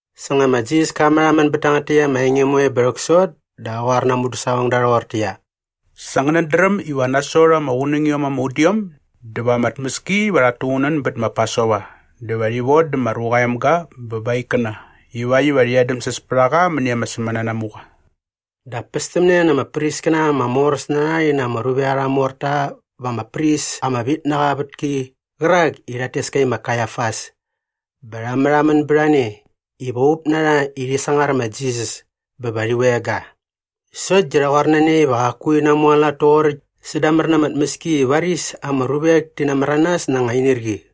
Sa nga ma Jisas ka märhamän bät tangät täkt ama enge moe bä rhäksot dä qa qoar na aa mudäsaqongda rhoqortäqyia, “Sa ngänät dräm iva nasot ama qunängiom ama udiom dä va ama tmäski iva rhat tuqunän bät ma Pasova dä va rhi vodä ma Ruqa aa Emga bä ba aa ikkäna ivakt iva rhi edämsäs pät a qa mäni ama sämänanamuqa.” Dap pästämne na ama priskäna ama moräs na rha rhi na ama ruvek arha morta va ama pris ama vit na qa aa vätki qärak i rhat tes ka i ma Kaiafas bä rha märhamän bät a ne iva up na rha i rhi sangar ma Jisas bä va rhi veng ga. Sokt di rha qoar na ne iva qaku rhi namualat toqoräkt sädamär na ama tmäski i varis ama ruvek ti namäranas na anga inirqi.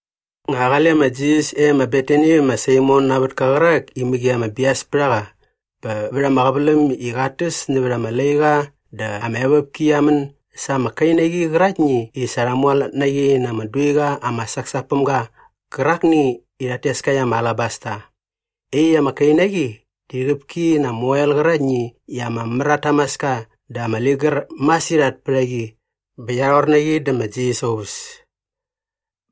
Nga qale ma Jisas e ma Betani vä ma Saimon aa vätka qärak i mäqi ama bias pät a qa bä vät ama qäväläm i qat täs nävät ama laiqa dä ama evopki qia män sa ama kainaqi qäraktni i sa rha mualat na qi na ama duiqa ama saksak päm ga qärakni i rhat tes ka i ama alabasta. Iaqyäkt ama kainaqi di rhäqäp ki na ama oel qäraktni i ama mär at tamaska dä ama ligär masirhat pät a qi bä qia rhor na qi dä ma Jisas aa uväs.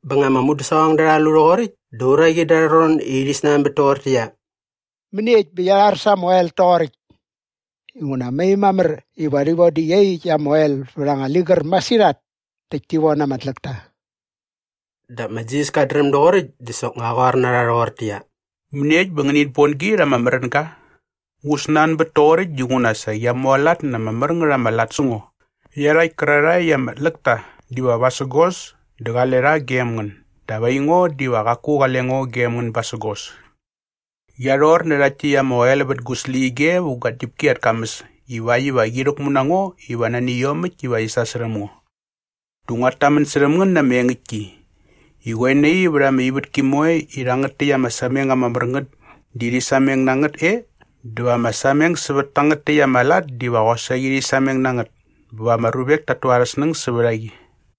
Bä nga ama mudäsaqongda rha lu rhoqoräkt dä uraqi da arha ron i rhi snanbät toqortäqyia, “Mäniekt bä qia rhar sa ama oel toqoräkt? Inguna mai mamär iva rhi vodä iaqyäkt ama oel iva vät anga ligär masirhat näkt ti von ama tläkta.” Dap ma Jisas kat dräm doqoräkt dä soknga qä qoar na rha rhoqortäqyia, “Mäniekt bä ngänit bon gi rha ama märänga? Ngu snanbät toqoräkt dinguna sa qia mualat na ama lat ama mär ngät sä ngo. Iarhakt kärarhae i ama tläk ta diva vasägos dä qale rha gem ngän dap aingo diva qaku qale ngo gem ngän basägos. Qia rhor nä rhakt täkt ama oel vät gu släqyige vä gua tñäpki at kamäs ivakt iva qi rhäkmu na ngo iva nani iomäkt iva rhi sasärhäm ngo. Dä nguat tamän särhäm ngän na ama engäktki i qoe nai vät ama ivätki moe i rhangät täkt ama sameng ama mär ngät di rhi sameng na ngät e dä va ama sameng sävät tangät täkt arha lat diva qosaqi rhi sameng na ngät bä va ama ruvek ta tu arhä snäng sävät a qi.”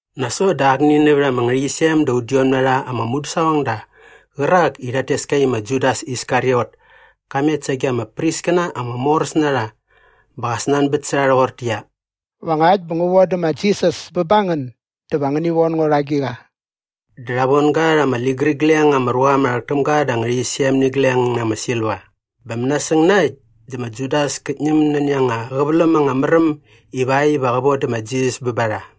Nasot dä akni nävät ama ngärhäqyisem da udiom na rha ama mudäsaqongda qärak i rhat tes ka i ma Judas Iskariot ka met sage ama priskäna ama moräs na rha bä qa snanbät sä rha rhoqortäqyia, “Va ngakt bä ngu vodä ma Jisas bä ba ngän dä va ngäni von ngo rha agiqa?” Dä rha von ga rha ama ligärigleng ama ruqa ama rhäk täm ga da ama ngärhäqyisem nä igleng na ama silva. Bä mänasäng na äkt dä ma Judas kät ñäm nani anga qäväläm anga mär äm ivakt iva qä vodä ma Jisas bä ba rha.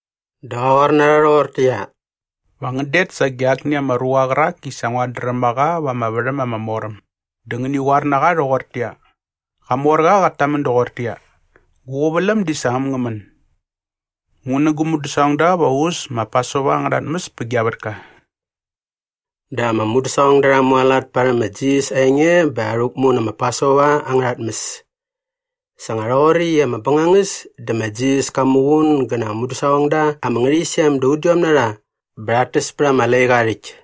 Dä qa qoar na rha rhoqortäqyia, “Va ngän det sage akni ama ruqa qärak i sa nguat dräm a qa va ama värhäm ama mor äm dä ngäni qoar na qa rhoqortäqyia, ‘Qamorqa qat tamän doqortäqyia, Gu qäväläm di sa äm ngä män. Ngu nä gu mudäsaqongda va u äs ma Pasova angärha tmäs pä gia vätka.’” Dä ama mudäsaqongda rha mualat parhäm ma Jisas aa enge bä rha rhäkmu nä ma Pasova angärha tmäs. Sa nga rhoqoräkt i ama bängangäs dä ma Jisas ka muqun gä na aa mudäsaqongda ama ngärhäqyisem da udiom na rha bä rhat täs pät ama laiqa aa rhäkt.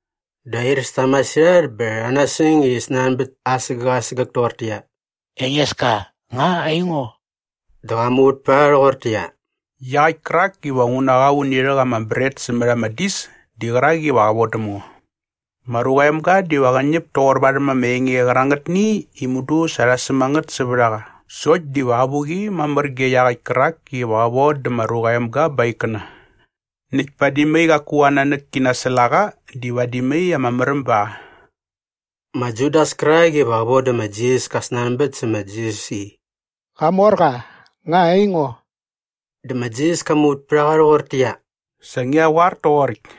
Dä airäs ta masirhat bä rha nasäng i rhi snanbät asägäk asägäk toqortäqyia, “Engeska, nga aingo?” Dä qa muvät pät a rha rhoqortäqyia, “Iaqäkt kärak iva ngu na qa uni rhäk ama bret sämät ama dis di qärak iva qä vodäm ngo. Ma Ruqa aa Emga diva qä ñäp toqor varhäm ama enge qärangätni i mudu sa rha säm a ngät sävät a qa sokt diva avuqi mamär ge iaqäkt kärak iva qä vodä ma Ruqa aa Emga ba aa ikkäna. Nak padi mai qaku aa nanäk ki nasäl a qa di vadi mai ama märäm ba qa.” Ma Judas kärak iva qä vodä ma Jisas ka snanbät sa ma Jisas i, “Qamorqa, nga aingo?” Dä ma Jisas ka muvät pät a qa rhoqortäqyia, “Sa ngia qoar toqoräkt.”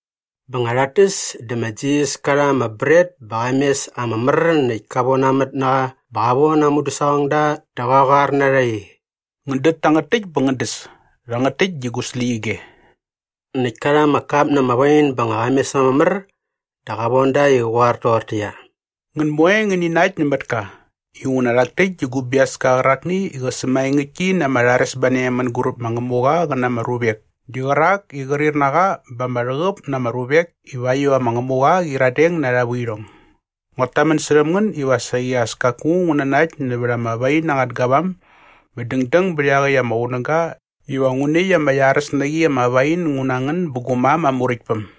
Bä nga rhat täs dä ma Jisas ka rha ama bret bä qa mes ama mär näkt ka vonamät na qa bä qa von aa mudäsaqongda dä qa qoar na rha i, “Ngän dät tangät täkt bä ngän däs. Rhangät täkt di gu släqyige.” Näkt ka rha ama kap na ama wain bä nga qa mes ama mär dä qa von da i qä qoar toqortäqyia, “Ngän moe ngäni nakt nämät ka inguna rhak täkt di gu biaska qärakni i qä sämaengäktki na ama rharesbane mänguräp ma Ngämuqa qä na ama ruvek di qärak i qrir na qa ba ama rhäqäp na ama ruvek ivakt iva ma Ngämuqa qä qyiradeng na arha vuirhong. Nguat tamän särhäm ngän iva saqi as kaku ngu nanakt nävät ama wain angät gavam bä dängdäng bät iaqäkt ama qunäga iva ngu näkt ama iaräs na qi ama wain ngu na ngän bä gu mam aa Muräktpäm.”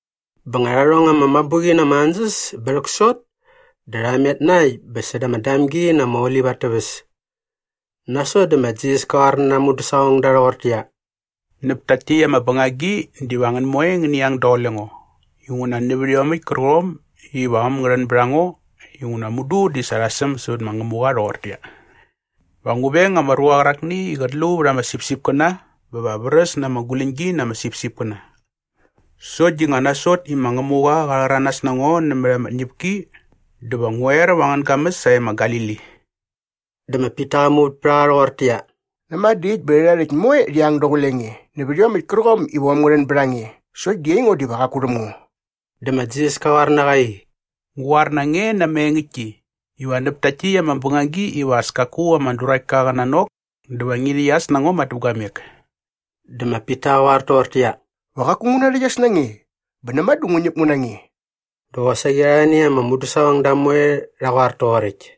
Bä nga rha rhong ama mabuqi na ama ansäs bä rhäksot dä rha met na äkt bä säda ama Damgi na ama Olip at täväs. Nasot dä ma Jisas ka qoar na aa mudäsaqongda rhoqortäqyia, “Näp takt täkt ama bängagi diva ngän moe ngäni ang daqule ngo inguna nävät iomäkt kärqom iva äm ngä rhän bät a ngo inguna mudu di sa rha säm sävät ma Ngämuqa rhoqortäqyia, “‘Va ngu veng ama ruqa qärakni i qät lu vät ama sipsipkäna bä va vräs na ama guläñgi na ama sipsipkäna.’ Sokt di nga nasot i ma Ngämuqa qa rhäranas na ngo nämät ama tñäpki dä va ngu er va angän gamäs sae ma Galili.” Dä ma Pita qa muvät pät a qa rhoqortäqyia, “Näma dä äkt bä rhärha rhäkt moe rhi ang daqule nge nävät iomäkt kärqom iva äm ngä rhän bät a nge sokt di aingo diva qaku rhäm ngo.” Dä ma Jisas ka qoar na qa i, “Ngu qoar na nge na ama engäktki iva näp takt täkt ama bängagi iva as kaku ama duraktka qä nanok dä va ngi rhäqyas na ngo madäpguamek.” Dä ma Pita qa qoar toqortäqyia, “Va qaku ngu narhäqyas na nge bä näma dä ngu ñäp ngu na nge.” Dä qosaqi arhani ama mudäsaqongda moe rha qoar toqoräkt.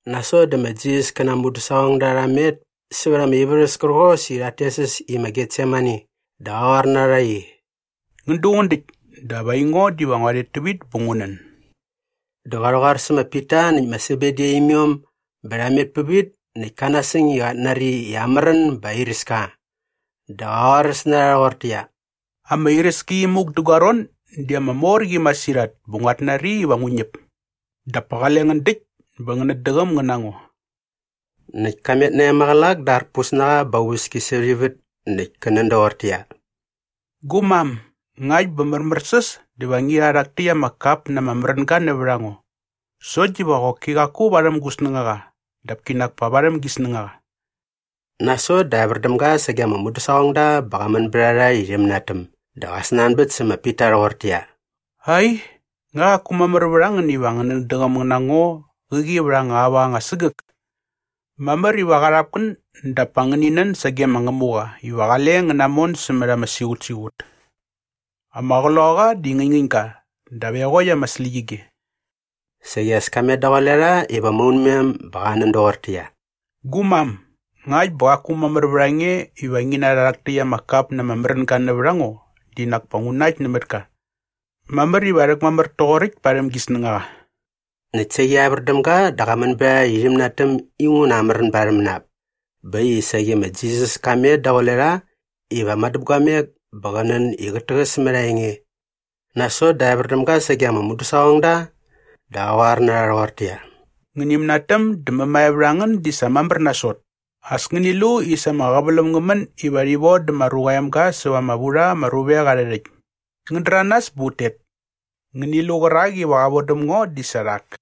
Nasot dä ma Jisas kä na aa mudäsaqongda rha met sävät ama ivärhäs kärqos i rhat tes äs i ma Getsemani dä qa qoar na rha i, “Ngän duqun däkt dap aingo diva ngua rhet tävit bä ngu nän.” Dä qa rhäqoar sä ma Pita näkt ma Sebedi aa imiom bä rha met pävit näkt ka nasäng i qat nari i amärän bä airäs ka. Dä qä qoaräs na rha rhoqortäqyia, “Ama iräski imuk dä gua ron di ama mor qi masirhat bä nguat nari iva ngu ñäp. Dap pa qale ngän däkt bä ngänät däqäm ngän na ngo.” Näkt ka met nae maqälak dä arpus na qa bä aa uväski sävät ivät näkt kä nän doqortäqyia, “Gu mam, ngakt bä märmärsäs dä va ngi rha rhak täkt ama kap na ama märänga nävät a ngo. Sokt diva qoki qaku varhäm gu snängaqa dap kinak pa varhäm gi snängaqa.” Nasot dä evär däm ga sage ama mudäsaqongda bä qa män bät a rha i rhi mänatäm dä qa snanbät sä ma Pita rhoqortäqyia, “Ai, nga qaku mamär vät a ngän iva ngänät däqäm ngän na ngo qäqi vät anga aua anga sägäk? Mamär iva qarhap ngän dap pa ngäni nän sage ma Ngämuqa iva qale ngän namon sämät ama siqutsiqut. Ama qloqaqa di ngäñngäñ ga dap eqokt ama släqyige.” Saqi as ka met daqule rha iva maunmem bä qa nän doqortäqyia, “Gu mam, ngakt bä qaku mamär vät a nge iva ngi narha rhak täkt ama kap na ama märänga nävät a ngo di nak pa ngu näkt nämät ka. Mamär iva rhäkmamär toqoräkt parhäm gi snängaqa.” Näkt saqi evär däm ga dä qa män bät a rha i rhi mänatäm inguna amärän ba arhä mänap. Bä äkt i saqi ma Jisas ka met daqule rha iva madäpguamek bä qä nän i qät täqäs mät aa enge. Nasot dä evär däm ga sage ama mudäsaqongda dä qa qoar na rha rhoqortäqyia, “Ngäni mänatäm dä mämae vät a ngän di sa mamär nasot. As ngäni lu i sa ama qäväläm ngä män iva rhi vodä ma Ruqa aa Emga säva ama vu rha ama ruvek arhä rhäkt. Ngän däranas bä ut tet. Ngäni lu qärak iva qä vodäm ngo di sa rhak.”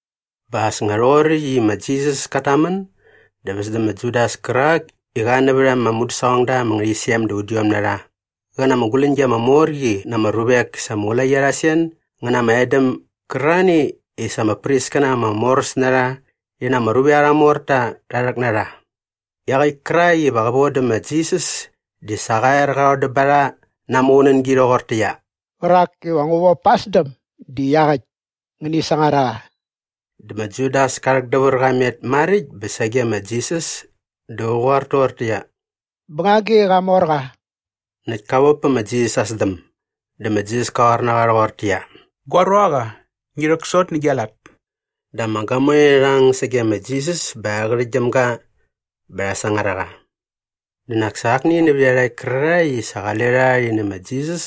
Bä as nga rhoqoräkt i ma Jisas kat tamän dä väs dä ma Judas kärak i qa nävät ama mudäsaqongda ama ngärhäqyisem da udiom na rha qä na ama guläñgi ama mor qi na ama ruvek sa ama ulaqi arha sen ngä na ama edäm gärarhani i sa ama priskäna ama moräs na rha rhi na ama ruvek arha morta rha rhäk na rha. Iaqäkt kärak iva qä vodä ma Jisas di sa qa er qa rhodäm ba rha na aa muqunängi rhoqortäqyia, “Qärak iva ngu vop pa aa sdäm di iaqäkt. Ngäni sangar a qa.” Dä ma Judas ka rhäkdävär qa met maräkt bä sage ma Jisas dä qä qoar toqortäqyia, “Bängagi qamorqa.” Näkt ka vop pä ma Jisas aa sdäm. Dä ma Jisas ka qoar na qa rhoqortäqyia, “Gua ruaqa, ngi rhäksot nä gia lat.” Dä ama gamoe rha ang sage ma Jisas bä rha qärhäktgyäm ga bä rha sangar a qa. Dä nak sa akni nävät iarhakt kärarhae i sa qale rha rhi nä ma Jisas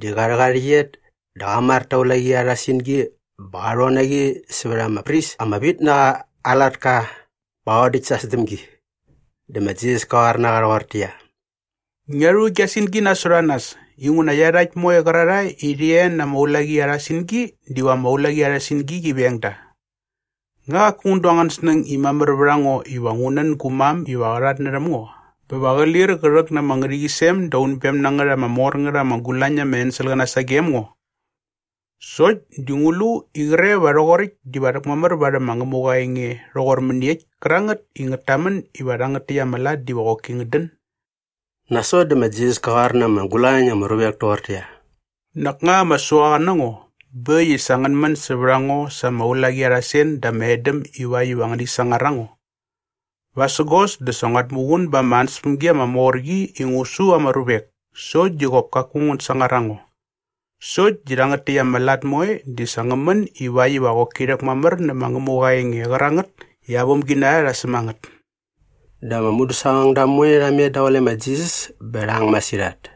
di qa rhäk aa rhäqyet dä qa mar ta aa ulaqi arha singi bä qa rhon na qi sävät ama pris ama vit na qa aa latka bä qa rhodäkt sa aa sdämgi. Dä ma Jisas ka qoar na qa rhoqortäqyia, “Ngia rhu gia singi nasot a nas inguna iarhakt moe qärarhae i rhi e na ama ulaqi arha singi diva ama ulaqi arha singi qi veng da. Nga qaku ngän du angän snäng i mamär vät a ngo iva ngu nän gu mam iva qa rhatnärhäm ngo bä va qä lir qä rhäk na ama ngärhäqyisem da unbem na ngät ama mor ngät ama gulañ na ama enselqäna sagem ngo? Sokt di ngu lu i qre va rhoqoräkt diva rhäkmamär varhäm ma Ngämuqa aa enge rhoqor mäniekt kärangät i ngät tamän iva rhangät täkt ama lat diva qoki ngät dän?” Nasot dä ma Jisas ka qoar na ama gulañ na ama ruvek toqortäqyia, “Nak nga ama suaqa na ngo bä äkt i sa ngän män sävät a ngo sa ama ulaqi arha sen dä ama edäm ivakt iva ngäni sangar a ngo? Vasägos dä sa nguat muqun ba ama ansäspämgi ama mor qi i ngu su ama ruvek sokt di qop kaku ngän sangar a ngo. Sokt di rhangät täkt ama lat moe di sa ngä män ivakt iva qoki rhäkmamär nä ma Ngämuqa aa enge qärangät i aa vämginarha rha säm a ngät.” Dä ama mudäsaqongda moe rha met daqule ma Jisas bä rha ang masirhat.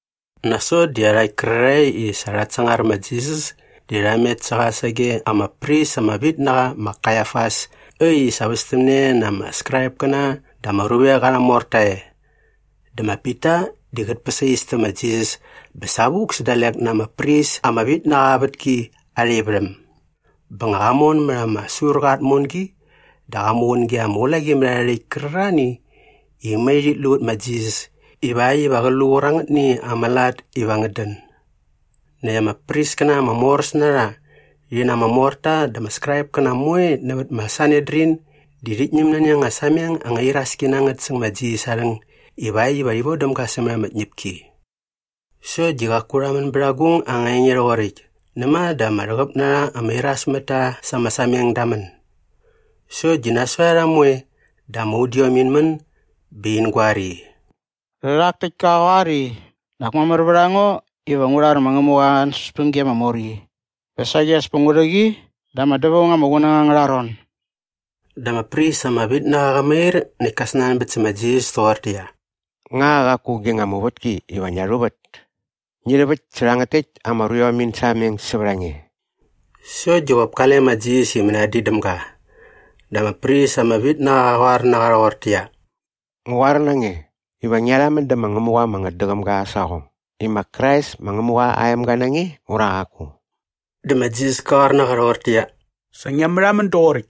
Nasot dä iarhakt kärarhae i sa rhat sangar ma Jisas di rha met sä qa sage ama pris ama vit na qa ma Kaiafas äkt i sa västämne na ama Skraipkäna dä ama ruvek arha morta e. Dä ma Pita di qät päsais tä ma Jisas bä savuk sä dalek na ama pris ama vit na qa aa vätki arha ivärhäm. Bä nga qa mon mät ama surqa aa tmongi dä qa muqun ge ama ulaqimärharhärhäkt kärarhani i mai rhit lu vät ma Jisas ivakt iva qä lu qärangätni ama lat iva ngät dän. Näkt ama priskäna ama moräs na rha rhi na ama morta dä ama Skraipkäna moe nävät ma Sanedrin di rhit ñäm nani anga sameng anga iraski na ngät säng ma Jisas aa rhäng ivakt iva rhi vodäm ga sämät ama tñäpki. Sokt di qaku rha män bät agung anga enge rhoqoräkt näma dä ama rhäqäp na rha ama irasmätta sa ama sameng da män. Sokt di nasot a rha moe dä ama udiom in män bä in goar i, “Rhärhak täkt ka qoar i, ‘Nak mamär vät a ngo iva ngu rhar ma Ngämuqa aa ansäspämgi ama mor qi bä saqi as pa ngu rhä qi da ama dävaung ama qunäng angärha ron.’” Dä ama pris ama vit na qa qa mair näkt ka snanbät sä ma Jisas toqortäqyia, “Nga qaku gi nga muvätki iva ngia rhuvät? Ngi rhäväkt sä rhangät täkt ama ruiom in sameng sävät a nge.” Sokt di qop kale ma Jisas i mänadin däm ga. Dä ama pris ama vit na qa qa qoar na qa rhoqortäqyia, “Ngu qoar na nge iva ngia rhamän dä ma Ngämuqa ama ngätdäqäm ga aa saqong i ma Krais ma Ngämuqa aa emga na nge ura qaku.” Dä ma Jisas ka qoar na qa rhoqortäqyia, “Sa ngia märhamän doqoräkt.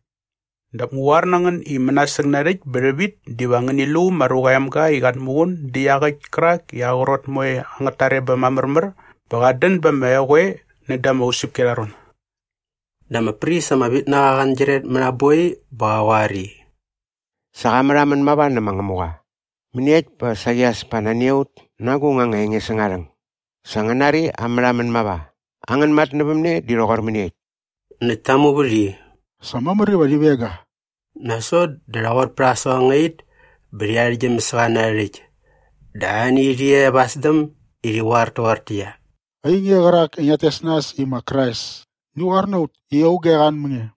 Dap ngu qoar na ngän i mänasäng narhäkt bä rhävit diva ngäni lu ma Ruqa aa Emga i qat muqun dä iaqäkt kärak i ama qrot moe angät tarebäm aa märmär bä qat dän ba ama eqoe näda ama usäpki arha ron.” Dä ama pris ama vit na qa angyiret mät aa boi bä qa qoar i, “Sa qa märhamän mava nä ma Ngämuqa. Mäniekt bä saqi as pa nani a ut na agung anga enge säng aa rhäng? Sa ngän nari aa märhamän mava. Angän matnävämne di rhoqor mäniekt?” Näkt ta muvät i, “Sa mamär iva rhi veng ga.” Nasot dä rha qot pät aa saqongait bä rhi arhäktgyäm sä qa na arhä rhäkt. Dä arhani rhi e va aa sdäm i rhi qoar toqortäqyia, “Ainge qärak i ngiat tes nas i ma Krais, ngi qoar na ut i auge qa an mä nge!”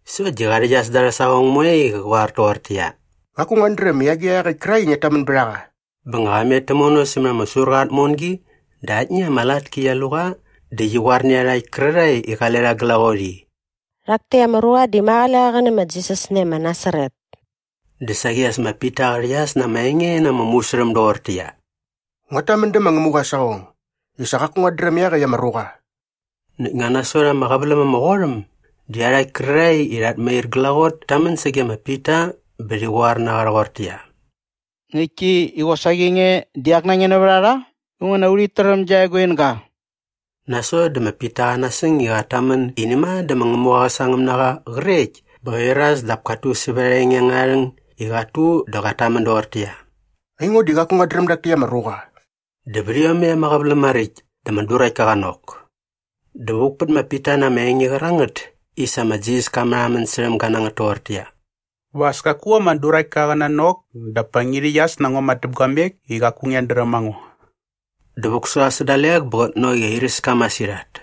Sokt di qa rhäqyas da arhä saqong moe i qä qoar toqortäqyia, “Qaku nguat dräm i agiqa iaqäkt kärak i ngiat tamän bät a qa.” Bä nga qa met tämono sämät ama surqa aa tmongi dä aktni ama latki qia lu qa dä qia qoar nä iarhakt kärarhae i qale rha glaqot i, “Rhak täkt ama ruqa di ma qale qa qä nä ma Jisas nae ma Nasaret.” Dä saqi as ma Pita qa rhäqyas na ama enge na ama musärhäm doqortäqyia, “Nguat tamän dä ma Ngämuqa aa saqong i sa qaku nguat dräm iaqäkt ama ruqa.” Näkt nga nasot ama qäväläm ama qot äm dä iarhakt kärarhae i rhat mair glaqot ta män sage ma Pita bä rhi qoar na qa rhoqortäqyia, “Ngäktki i qosaqi nge di ak na nge nävät a rha inguna urhit träm gia eguinga.” Nasot dä ma Pita qa nasäng i qat tamän i näma dä ma Ngämuqa qä sangäm na qa qrekt bä qa iras dap kat tu sävät aa enge angärha rhäng i qat tu dä qat tamän doqortäqyia, “Aingo di qaku nguat dräm dak täkt ama ruqa.” Dä vät iomäkt ama qäväläm maräkt dä ama duraktka qa nok. Dä vuk pät ma Pita na ama enge qärangät i sa ma Jisas ka märhamän särhäm ga na ngät toqortäqyia, “Va as kaku ama duraktka qa nanok dap pa ngi rhäqyas na ngo madäpguamek i qaku ngiat dräm a ngo.” Dä vuk sä qa sä dalek bä qät nok i airäs ka masirhat.